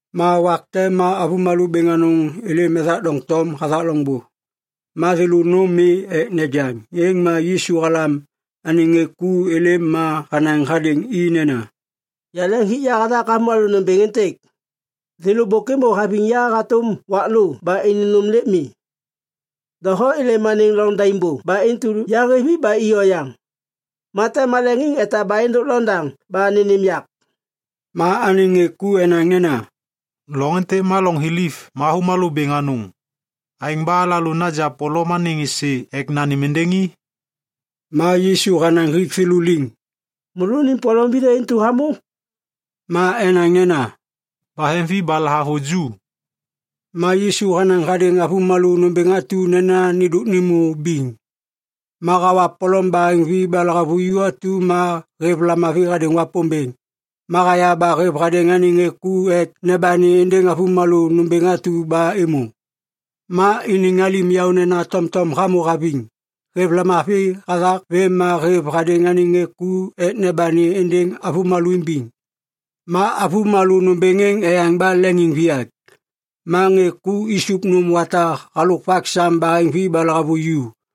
Ma wak te ma avômalô bêŋ anôŋ êlêm ethak doŋtom hathak loŋbô. Ma thêlô nôm mi ek nejaŋ. Êŋ ma Yisu halam anêŋ ŋê ku êlêm ma hanaŋ hadêŋ i nena, “Yaleŋ hik ya hathak avômalô nômbêŋ êntêk. Thêlô bôk êmô haviŋ ya hatôm wak lô ba iniŋ nôm lêk mi. Doho êlêm anêŋ loŋ daim bô ba intu yahêv i ba i oyaŋ, ma tem maleŋiŋ etaba êndôk loŋôndê ba nênêm yak.” Ma anêŋ ŋê ku enaŋ nena, “Loŋ êntêk ma loŋ thiliv ma avômalô bêŋ anôŋ. Aêŋ ba alalô naja polom anêŋ êsê ek nanêm êndêŋ i?” Ma Yisu hanaŋ hik thêlô liŋ, “Môlônim polom vithê intu hamô?” Ma enaŋ nena, “Baheŋvi ba lahavuju.” Ma Yisu hanaŋ hadêŋ avômalô nômbêŋ atu nena nêndôk nêmô biŋ. Ma hawa polom baheŋvi ba lahavuju atu ma hêv lamavi hadêŋ Wapômbêŋ. Ma haya ba hêv hadêŋ anêŋ ŋê ku ek nebani êndêŋ avômalô nômbêŋ atu ba êmô. Ma iniŋ alim yaônena tomtom hamô haviŋ. Hêv lamavi hathak vêm ma hêv hadêŋ anêŋ ŋê ku ek nebani êndêŋ avômalô imbiŋ. Ma avômalô nômbêŋ êŋ eyaŋ ba leŋiŋviyak. Ma ŋê ku isup nôm wata halôk vak sam baheŋvi ba lahavuju.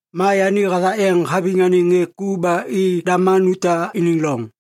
Ma yani hathak yeŋ haviŋ anêŋ ŋê ku ba i Dalmanuta iniŋ loŋ.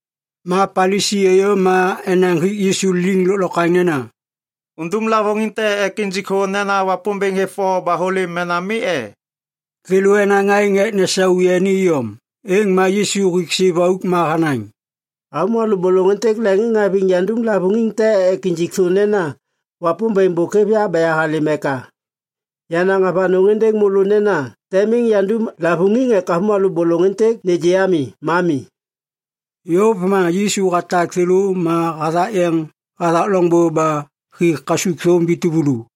Ma Palisi êyô ma enaŋ hik Yisu liŋ lôklokwaŋ nena, “Undum lavôŋiŋ te ek injik thô nena Wapômbêŋ hêv o ba hôlêm mena mi e?” Thêlô enaŋ aêŋ ek nesau yani iyom. Êŋ ma Yisu hik siv auk ma hanaŋ, “Avômalô bôlôŋ êntêk leŋiŋhaviŋ yandum lavôŋiŋ te ek injik thô nena Wapômbêŋ bôk hêv ya ba yahalêm eka. Yanaŋ avanôŋ êndêŋ môlô nena tem miŋ yandum lavôŋiŋ ek avômalô bôlôŋ êntêk nêgê ami, ma mi.” Yôv ma Yisu hatak thêlô ma hathak yeŋ hathak loŋbô ba hi kasukthôm vi tuvulu.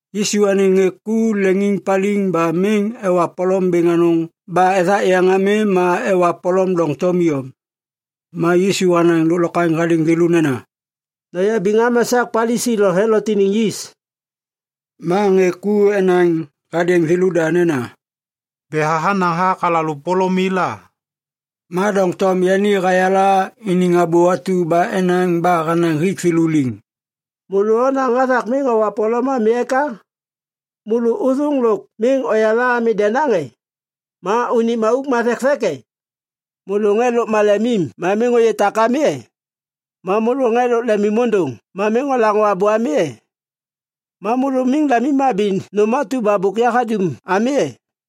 Yisu anêŋ ŋê ku leŋiŋpaliŋ ba miŋ ewa polom bêŋ anôŋ ba ethak yeŋ ami ma ewa polom doŋtom iyom. Ma Yisu hanaŋ lôklokwaŋ hadêŋ thêlô nena, “Noyabiŋ am esak Palisi lo Helot iniŋ yis.” Ma ŋê ku enaŋ hadêŋ thêlôda nena, “Betha hanaŋ hathak alalô polom mi la.” Ma doŋtom yani hayala iniŋ abô atu ba enaŋ ba hanaŋ hik thêlô liŋ, “Môlô onaŋ hathak miŋ owa polom ami eka? Môlô ôthôŋ lôk miŋ oyala ami denaŋ e? Ma unim auk ma thekthek e? Môlô ŋê lôk malemim ma miŋ ôyê tak ami e? Ma môlô ŋê lôk lemimôndôŋ ma miŋ olaŋô abô ami e? Ma môlô miŋ lemimhabi nôm atu ba bôk yahadum ami e?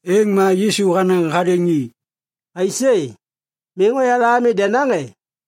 Êŋ ma Yisu hanaŋ hadêŋ i, “Aisê, miŋ oyala ami denaŋ e?”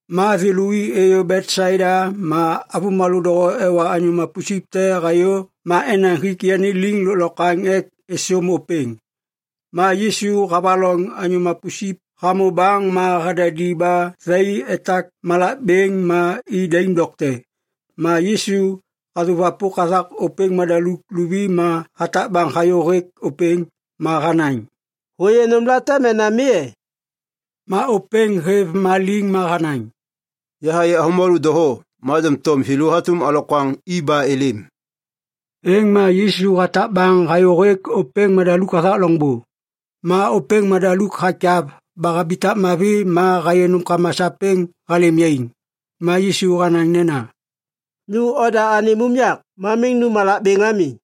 Ma thêlô i êyô Betsaida ma avômalô doho ewa anyô mapusip te hayô ma enaŋ hik yani liŋ lôklokwaŋ ek êsôm ôpêŋ. Ma Yisu havaloŋ anyô mapusip hamô baŋ ma hadadi ba thai etak malak bêŋ ma i daim dokte. Ma Yisu hasôwapôk hathak ôpêŋ madaluk luvi ma hatak baŋ hayô hêk ôpêŋ. Ma hanaŋ, “Hôyê nômlate mena mi e?” Ma ôpêŋ hêv ma liŋ ma hanaŋ, “Yahayê avômalô doho, ma doŋtom thêlô hatôm alokwaŋ i ba êlêm.” Êŋ ma Yisu hatak baŋ hayô hêk ôpêŋ madaluk hathak loŋbô. Ma ôpêŋ madaluk hakyav ba habitak mavi ma hayê nômkama sapêŋ halêm yaiŋ. Ma Yisu hanaŋ nena, “Nu oda anêm unyak ma miŋ nu malak bêŋ ami.”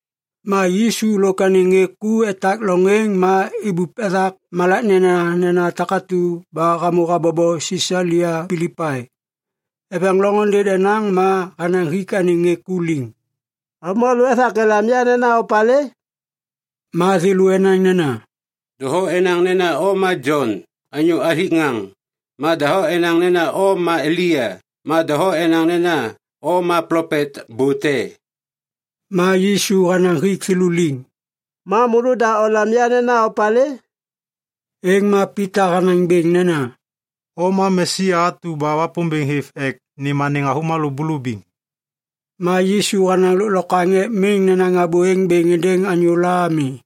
Ma Yisu lôk anêŋ ŋê ku etak loŋ êŋ ma ibup ethak malak nenanena takatu ba hamô habobo Sisalia Pilipai. Eveŋ loŋôndê denaŋ ma hanaŋ hik anêŋ ŋê ku liŋ, “Avômalô ethak elam ya nena opalê?” Ma thêlô enaŋ nena, “Doho enaŋ nena o ma Jon anyô hathik ŋaŋ ma doho enaŋ nena o ma Elia ma doho enaŋ nena o ma plopet bô te.” Ma Yisu hanaŋ hik thêlô liŋ, “Ma môlôda olam ya nena opalê?” Êŋ ma Pita hanaŋ bêŋ nena, “O ma Mesia atu ba Wapômbêŋ hêv ek nêm anêŋ avômalô bulubiŋ.” Ma Yisu hanaŋ lôklokwaŋ ek miŋ nenaŋ abô êŋ bêŋ êndêŋ anyôla ami.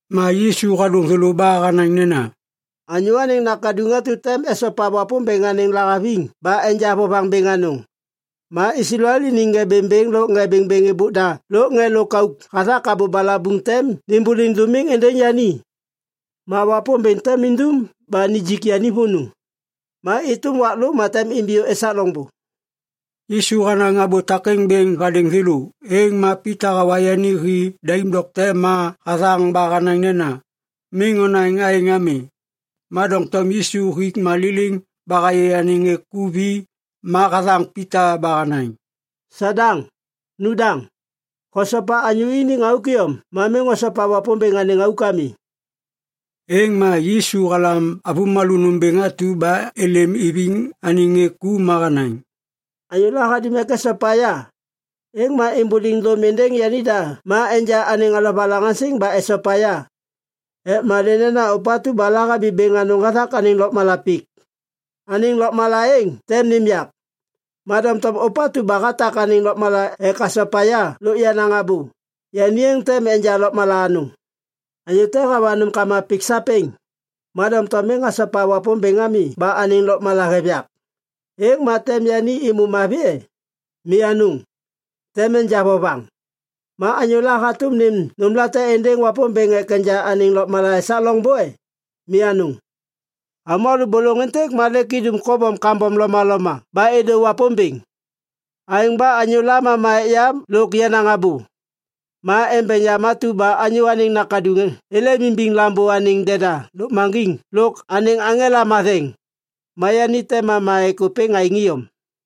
Ma Yisu hadôŋ thêlô ba hanaŋ nena, “Anyô Anêŋ Nakaduŋ atu tem esopa Wapômbêŋ anêŋ lahaviŋ ba enja vovaŋ bêŋ anôŋ. Ma Islael iniŋ ŋê bêŋbêŋ lôk ŋê bêŋbêŋ êbôk da lôk ŋê lôkauk hathak abô balabuŋ tem nimbuliŋ dômiŋ êndêŋ yani. Ma Wapômbêŋ tem indum ba nijik yani vônô. Ma êtôm wak lô ma tem imbiyô esak loŋbô.” Yisu hanaŋ abô takêŋ bêŋ hadêŋ thêlô, êŋ ma Pita hawa yani hi daim dokte ma hathaŋ ba hanaŋ nena, “Miŋ onaŋ aêŋ ami.” Ma doŋtom Yisu hik ma liliŋ ba hayê anêŋ ŋê ku vi ma hathaŋ Pita ba hanaŋ, “Sadaŋ, nu daŋ! Hosopa anyô iniŋ auk iyom ma miŋ hosopa Wapômbêŋ anêŋ auk ami.” Êŋ ma Yisu halam avômalô nômbêŋ atu ba êlêm iviŋ anêŋ ŋê ku ma hanaŋ, “Anyôla hadum ek esopa ya, êŋ ma êmbôliŋ dôm êndêŋ yanida ma enja anêŋ alovalaŋaŋsiŋ ba esopa ya. Ek malê nena ôpatu ba lahabi bêŋ anôŋ hathak anêŋ lôkmala pik, anêŋ lôkmala êŋ tem nêm yak. Ma doŋtom ôpatu ba hatak anêŋ lôkmala ek hasopa ya lôk yenaŋ abô, yani êŋ tem enja lôkmala anôŋ. Anyô te hawa nômkama pik sapêŋ, ma doŋtom miŋ hasopa Wapômbêŋ ami ba anêŋ lôkmala hêv yak, êŋ ma tem yani êmô mavi e? Mi anôŋ, tem enja vovaŋ. Ma anyôla hatôm nêm nômlate êndêŋ Wapômbêŋ ek enja anêŋ lôkmala esak loŋbô e? Mi anôŋ! Avômalô bôlôŋ êntêk ma lêk idum kobom kambom lomaloma ba êdô Wapômbêŋ. Aêŋ ba anyôla mama ek ya lôk yenaŋ abô, ma embeŋ yam atu ba Anyô Anêŋ Nakaduŋ êlêm imbiŋ Lambô anêŋ deda lôkmaŋgiŋ lôk anêŋ aŋela matheŋ, ma yani tem mama ek ôpêŋ aêŋ iyom.”